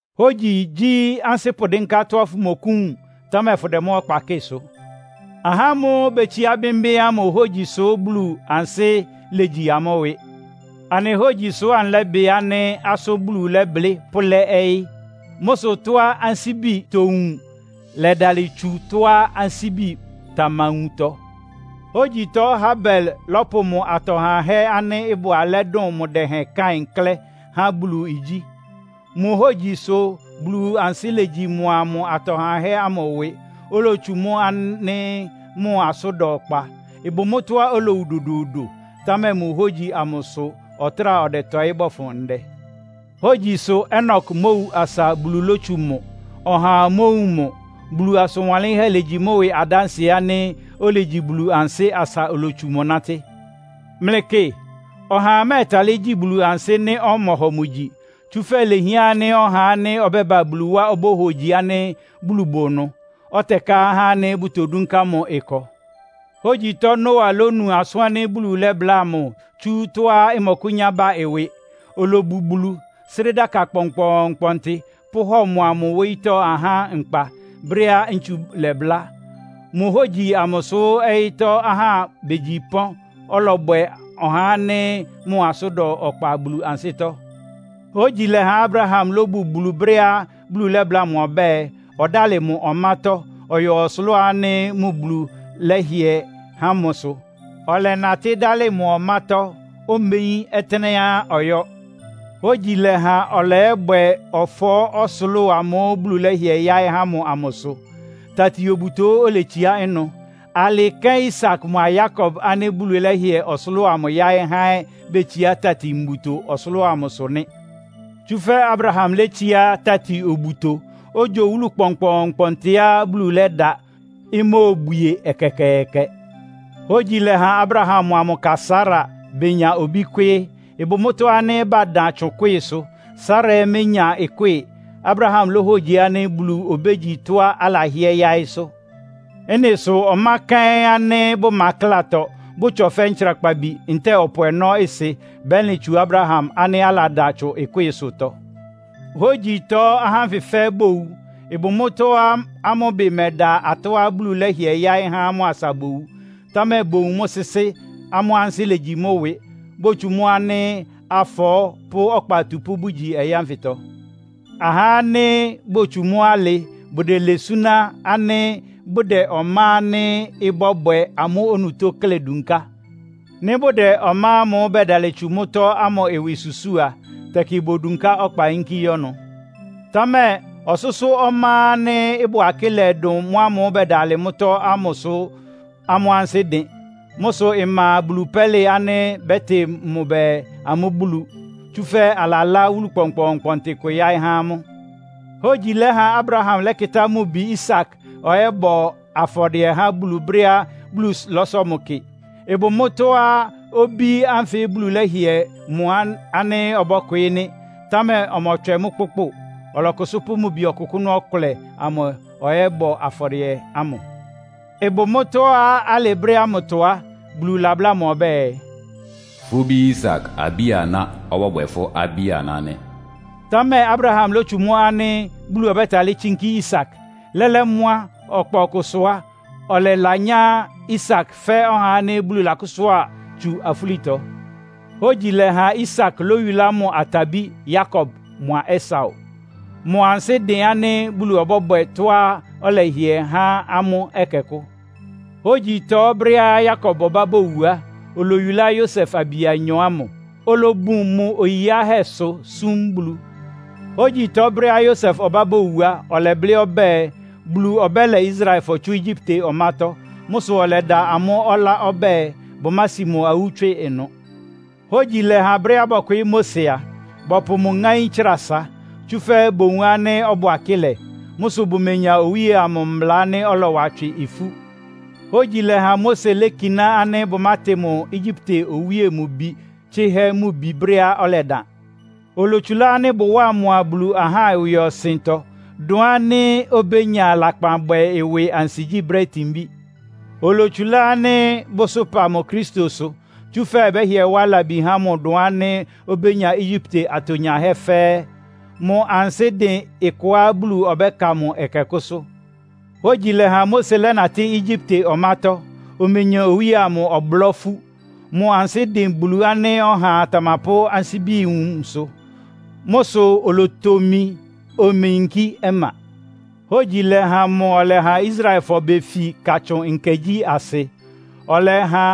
Hógyi gyí ansɩ́ pʋdɩ́nká tɔ́á fʋmɔkʋ́wun, támɛ fʋdɛ mʋ́ ɔkpa kɩ́sʋ. Ahá ámʋ́ʋ́ betsiá bɩ́mbɩ́ ámʋ hógyi sʋ́ Bulu ansɩ́ légyi amʋ́ ɩwɩ. Anɩ hógyi sʋ́ anɩlɛ́bɩ ánɩ́ asʋ́n Bulu lɛ́blɩ́ pʋ́lɛ́ ɔyɩ́. Mʋ́ sʋ tɔ́á ansíbi towun lɛdalɩ tsu tɔ́á ansíbi tamawuntɔ. Hógyitɔ Habel lɔ́pʋ mʋ atɔ hahɛ́ ánɩ́ ɩbʋ alɛ́ dʋn mʋ dɛhɛn Kain klɛ́ há Bulu igyí. Mʋ hógyi sʋ Bulu ansɩ́ legyi mʋa mʋ atɔ hahɛ́ ámʋ ɩwɩ, olotsu mʋ ánɩ́ mʋ asʋ́n da ɔkpa. Ɩbʋ mʋ́tɔ́á olowu dodoodo, támɛ mʋ hógyi amʋ sʋ ɔtráa ɔdɛtɔɩ́ bɔfʋn ndɛ. Hógyi sʋ Enok mówu asa Bulu lótsu mʋ, ɔhaa mówun mʋ. Bulu asʋn wanlɩ́nhɛ́ legyi mʋ ɩwɩ adánsɩɛ ánɩ́ olegyi Bulu ansɩ́ asa olotsu mʋ nátɩ́. Mlɩkɩ, ɔhaa mɛ́ɛtalɩ́ gyi Bulu ansɩ́ nɩ́ ɔmɔhɔ mʋ gyi. Tsúfɛ́ ilehián ánɩ́ ɔhá ánɩ́ ɔbɛ́ba Bulu wá obóhogyi ánɩ́ Bulu bʋ ɩnʋ, ɔtɛká ahá ánɩ́ bʋtodúnká mʋ ɩkɔ. Hógyitɔ Noa lónu asʋ́n ánɩ́ Bulu lɛ́bláa mʋ tsú tɔ́á ɩmɔkʋ́nyá ba ɩwɩ. Olobu Bulu, sré dáka kpɔnkpɔɔnkpɔntɩ, pʋ́hɔ mʋa mʋ wóyítɔ́ ahá nkpa, brɛ́á ntsu lɔbʋlá. Mʋ hógyi amʋ sʋ́ ɔyɩ́tɔ́ ahá begyi pɔ́n, ɔlɔbwɛ ɔhá ánɩ́ mʋ asʋ́n da ɔkpa Bulu ansɩ́tɔ́. Hógyi lɛ́ha Abraham lóbu Bulu brɛ́á Bulu lɛ́bláa mʋ ɔbɛ́ɛ, ɔdálɩ mʋ ɔmátɔ́, ɔyɔ ɔsʋlʋ́ʋ ánɩ́ mʋ Bulu lɛ́hɩɛ há mʋsʋ. Ɔlɛnatɩ́ dálɩ mʋ ɔmátɔ́, omeyín ɔtɩ́nɛ́á ɔyɔ́. Hógyi lɛ́ha ɔlɔyɔ́bwɛ ɔfɔɔ́ ɔsʋlʋ́ʋ amʋ́ʋ́ Bulu lɛ́hɩɛ yáɩ́ há mʋ amʋsʋ. Tati-obuto oletsiá ɩnʋ. Alɩ kɛ́n Isak mʋa Yakob ánɩ́ Bulu lɛ́hɩɛ ɔsʋlʋ́ʋ amʋ yáɩ́ há ɛ́ betsiá tati-mbuto ɔsʋlʋ́ʋ amʋsʋ nɩ́. Tsúfɛ́ Abraham létsiá tati-obuto, ogyo wúlu kpɔnkpɔɔnkpɔntɩá Bulu lɛ́da, imóobwie ɛkɛkɛɛkɛ. Hógyi lɛ́ha Abraham mʋa mʋ ka Sara benya obí kwɩ́ɩ́. Ɩbʋ mʋ́tɔ́ ánɩ́ badan tsʋn ɩkwɩ́ɩsʋ, Sara ɛ́ ménya ɩkwɩ́ɩ. Abraham lóhogyi ánɩ́ Bulu obégyi tɔ́á alahɩ́ɛ́ yáɩ́sʋ́. Ɩ́nɩ sʋ ɔmá kɛ́ɩ́n ánɩ́ bʋma ɩklátɔ, bʋtsɔ fɛ́ ntsrakpabi ntɛ́ɛ ɔpʋ ɔnɔ́ ɩsɩ bɛlɩn tsu Abraham ánɩ́ aladan tsʋn ɩkwɩ́ɩsʋtɔ. Hógyitɔ ahá ánfɩ fɛ́ɛ́ bowu. Ɩbʋ mʋ́tɔ́á amʋ́ ɩbɩ mɛda atɔ́á Bulu lɛ́hɩɛ yáɩ́ há amʋ́ asa bowu. Támɛ bowun mʋ́ sɩ́sɩ́, amʋ́ ansɩ́ légyi mʋ́ ɩwɩ. Botsu mʋ́ ánɩ́ afɔɔ́ pʋ́ ɔkpa atupʋ́ bʋgyi ɔyɩ́ ánfɩtɔ. Ahá ánɩ́ botsú mʋ́ alɩ bʋdɛlɛ súná ánɩ́ bʋdɛ ɔmá ánɩ́ ɩbɔ́bwɛ amʋ́ onutó klɛ́ dunká. Nɩ́ bʋdɛ ɔmá ámʋ́ʋ́ bɛdalɩ tsu mʋ́tɔ́ ámʋ ɩwɩ susúu a, tɛkɩ bodunká ɔkpa yínkí yɔ́ ɩnʋ. Támɛ ɔsʋ́sʋ́ ɔmá ánɩ́ ɩbʋ akɩ́lɛ dʋn mʋ́ ámʋ́ʋ́ bɛdalɩ mʋ́tɔ́ ámʋsʋ amʋ́ ansɩ́ dɩn. Mʋ́ sʋ ɩma Bulu pɛ́lɩ ánɩ́ bɛ́tɩ mʋ bɛɛ, amʋ́ Bulu. Tsúfɛ́ alalá wúlu kpɔnkpɔɔnkpɔntɩ kʋ yáɩ́ há amʋ́. Hógyi lɛ́ha Abraham lɛ́kɩtá mʋ bi Isak ɔyɔ́bɔ afɔdɩɛ há Bulu brɛ́á Bulu lɔ́sɔ mʋ kɩ. Ɩbʋ mʋ́tɔ́á obí ánfɩ Bulu lɛ́hɩɛ mʋ ánɩ́ ɔbɔ́kwɩɩ́ nɩ́, támɛ ɔmɔtswɛ mʋ́ kpʋ́kpʋ. Ɔlɔkʋsʋ́ pʋ́ mʋ bi ɔkʋkʋ́nʋ́ ɔkʋlɛ amʋ ɔyɔ́bɔ afɔdɩɛ ámʋ. Ɩbʋ mʋ́tɔ́á alɩ brɛ́ ámʋtɔ á, Bulu labláa mʋ ɔbɛ́ɛ, “Fʋ́ bí Isak abí-aná ɔbɔ́bwɛ fʋ́ abí-aná nɩ́.” Támɛ Abraham lótsu mʋ́ ánɩ́ Bulu ɔbɛ́talɩ́ tsínkí Isak. Lɛ́lɛ́ mʋ́, ɔkpa ɔkʋsʋ á, ɔlɛlanyá Isak fɛ́ ɔhá ánɩ́ Bulu lakʋ́sʋ́a tsu afúlitɔ. Hógyi lɛ́ha Isak lóyulá mʋ atabí Yakob mʋa Esau. Mʋ ansɩ́ dɩn ánɩ́ Bulu ɔbɔ́bwɛ tɔ́á ɔlɛhɩɛ há amʋ́ ɛkɛkʋ́. Hógyitɔ brɛ́á Yakob ɔbá bowu á, oloyulá Yosef abi anyɔ ámʋ, olobun mʋ oyi yiáhɛ́sʋ súm Bulu. Hógyitɔ brɛ́á Yosef ɔbá bowu á, ɔlɛblɩ́ ɔbɛ́ɛ, Bulu ɔbɛ́lɛ Israelfɔ tsú Egyipte ɔmátɔ́. Mʋ́ sʋ ɔlɛda amʋ́ ɔlá ɔbɛ́ɛ, bʋmási mʋ awú tswɩ ɩnʋ. Hógyi lɛ́ha brɛ́á bɔkwɩɩ́ Mose a, bɔpʋ mʋ ŋáín tsra asa. Tsúfɛ́ bowun ánɩ́ ɔbʋ akɩ́lɛ. Mʋ́ sʋ bʋmenya owíe amʋ mbla ánɩ́ ɔlɔwa tswɩ ifú. Hógyi lɛ́ha Mose lékiná ánɩ́ bʋmátɩ mʋ Egyipte owíe mʋ bi tsɩ́hɛ́ mʋ bi brɛ́á ɔlɛdan. Olotsulá ánɩ́ bʋwáa mʋa Bulu ahá ɩwɩɔsɩntɔ, dʋn ánɩ́ obénya lakpanbwɛ ɩwɩ ansigyí brɛ́ itinbí. Olotsulá ánɩ́ bʋsʋ́pa mʋ Kristo sʋ. Tsúfɛ́ ɩbɛ́hɩɛ wá labi há mʋ dʋn ánɩ́ obénya Egyipte atonyahɛ́ fɛ́ɛ́. Mʋ ansɩ́ dɩn ɩkɔá Bulu ɔbɛ́ka mʋ ɛkɛkʋ́sʋ́. Hógyi lɛ́ha Mose lɛ́natɩ́ Egyipte ɔmátɔ́, omenya owíe amʋ ɔblɔ́ ifú. Mʋ ansɩ́ dɩn Bulu ánɩ́ ɔhaa tamapʋ́ ansíbi wunsʋ. Mʋ́ sʋ olotomi, omeyinkí ɔma. Hógyi lɛ́ha mʋ ɔlɛha Israelfɔ befi Katsʋn Nkɛ gyí asɩ. Ɔlɛha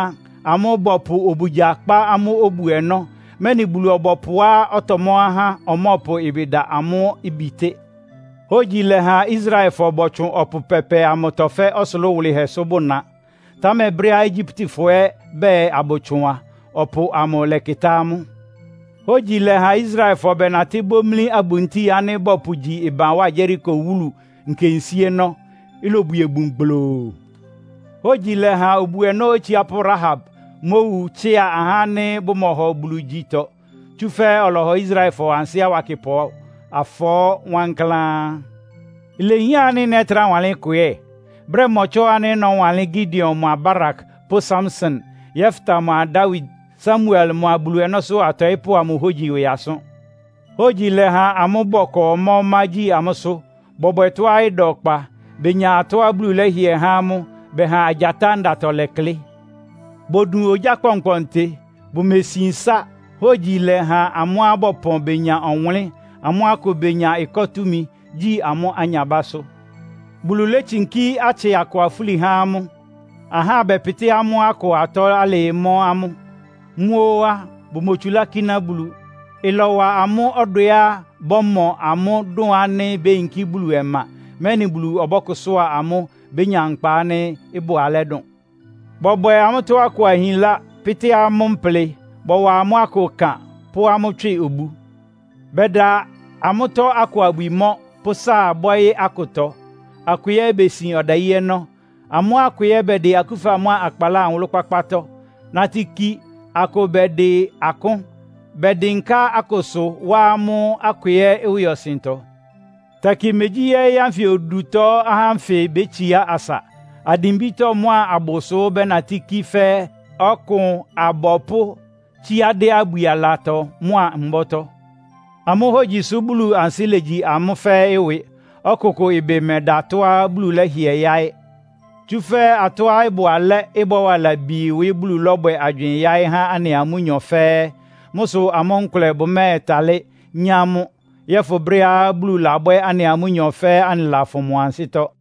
amʋ́ bɔpʋ obugya kpá amʋ́ obu-ɔnɔ́, mɛ́nɩ Bulu-ɔbɔpʋá ɔtɔmɔ́ ahá ɔmɔ́ɔpʋ ɩbɩ da amʋ́ bitɩ́. Hógyi lɛ́ha Israelfɔ bɔtsʋn Ɔpʋ Pɛpɛ amʋtɔ fɛ́ ɔsʋlʋ́ʋ wʋlɩhɛsʋ bʋ́na. Támɛ brɛ́á Egyiptefɔ ɛ́ bɛɛ abʋtsʋn a, ɔpʋ amʋ lɛ́kɩtá amʋ́. Hógyi lɛ́ha Israelfɔ bɛnatɩ́ bómlí abuntíi ánɩ́ bɔpʋgyi ɩban wá Yeriko wúlu nkensíénɔ́, ilobwie bun gbloo. Hógyi lɛ́ha obu-ɔnɔ́ otsiápʋ́ Rahab mówu tsɩ́a ahá ánɩ́ bʋmɔhɔ Bulu gyitɔ. Tsúfɛ́ ɔlɔhɔ Israelfɔ ansɩ́ awakɩpʋ afɔɔ́ wankláán. Ilehián ánɩ́ nɛ́trá wanlɩ́n ɩkʋ ɛ́? Brɛ́ mɔtsɔ́ ánɩ́ nɔ́wanlɩ́n Gideon mʋa Barak pʋ́ Samson, Yefta mʋa Dawid, Samuel mʋa Bulu ɔnɔ́sʋ́ atɔɩ́pʋ́ amʋ hógyi ɩwɩ asʋ́n. Hógyi lɛ́ha amʋ́ bɔkɔ ɔmá-ɔmá gyi amʋ́sʋ́, bɔbwɛ tɔ́á ɩda ɔkpa. Benya atɔ́á Bulu lɛ́hɩɛ há amʋ́, bɛha agyatá ndatɔ lɛklɩ́. Bodun ogyá kpɔnkpɔntɩ, bʋmesin ɩsá. Hógyi lɛ́ha amʋ́á bɔpɔn benya ɔwʋnlɩ́n, amʋ́ akʋ benya ɩkɔ́ túmi, gyi amʋ́ anyabásʋ́. Bulu létsinkí atsɩ akʋ afúli há amʋ́. Ahá bɛpɩtɩ́ amʋ́ akʋ atɔ́ alɩɩ mɔ́ amʋ́. Mʋ́ óó á, bʋmotsulá kíná Bulu. Ɩlɔwa amʋ́ ɔdwɛá bɔ́mɔ amʋ́ dʋn ánɩ́ béyinkí Bulu ɔma, mɛ́nɩ Bulu ɔbɔ́kʋsʋ́a amʋ́, bénya nkpa ánɩ́ ɩbʋ alɛ́ dʋn. Bɔbwɛ amʋ́tɔ́ akʋ ahinlá, pɩ́tɩ́ amʋ́ mplɩ. Bɔwa amʋ́ akʋ ɩkan, pʋ́ amʋ́ tswɩ obu. Bɛda amʋ́tɔ́ akʋ abwi mɔ́, pʋ́ sáa bɔ́ɩ́ akʋtɔ, akʋ ɛ́ besin ɔdayí ɔnɔ́. Amʋ́ akʋ ɛ́ bɛdɩ akúfa mʋ́a akpaláa nwʋlʋ́-kpákpátɔ́ nátɩ́ kí, akʋ bɛdɩ akʋ́n. Bɛdɩnká akʋsʋ, wá amʋ́ akʋ ɛ́ ɩwɩɔsɩntɔ. Tɛkɩ megyí ɔyɩ́ ánfɩ odutɔ ahá ánfɩ bétsiá asa. Adimbítɔ́ mʋ́a abʋsʋ bɛnatɩ́ kí fɛ́ ɔkʋn abɔpʋ́, tsíá dɩ́ abwi alatɔ mʋ́a mbɔ́tɔ́. Amʋ́ hógyi sʋ́ Bulu ansɩ́ légyi amʋ́ fɛ́ɛ́ ɩwɩ. Ɔkʋkʋ ɩbɩ mɛda tɔ́á Bulu lɛ́hɩɛ yáɩ́. Tsúfɛ́ atɔ́á ɩbʋ alɛ́, ɩbɔ́wa labi ɩwɩ Bulu lɔ́bwɛ agywɩɩn yáɩ́ há anɩa amʋ́nyɔ fɛ́ɛ́. Mʋ́ sʋ amʋ́ nkʋlɛ bʋmɛ́ɛtalɩ́ nyá mʋ́, yɔ́fʋn brɛ́á Bulu labwɛ́ anɩa amʋ́nyɔ fɛ́ɛ́ anɩlafʋn mʋ ansɩ́tɔ́.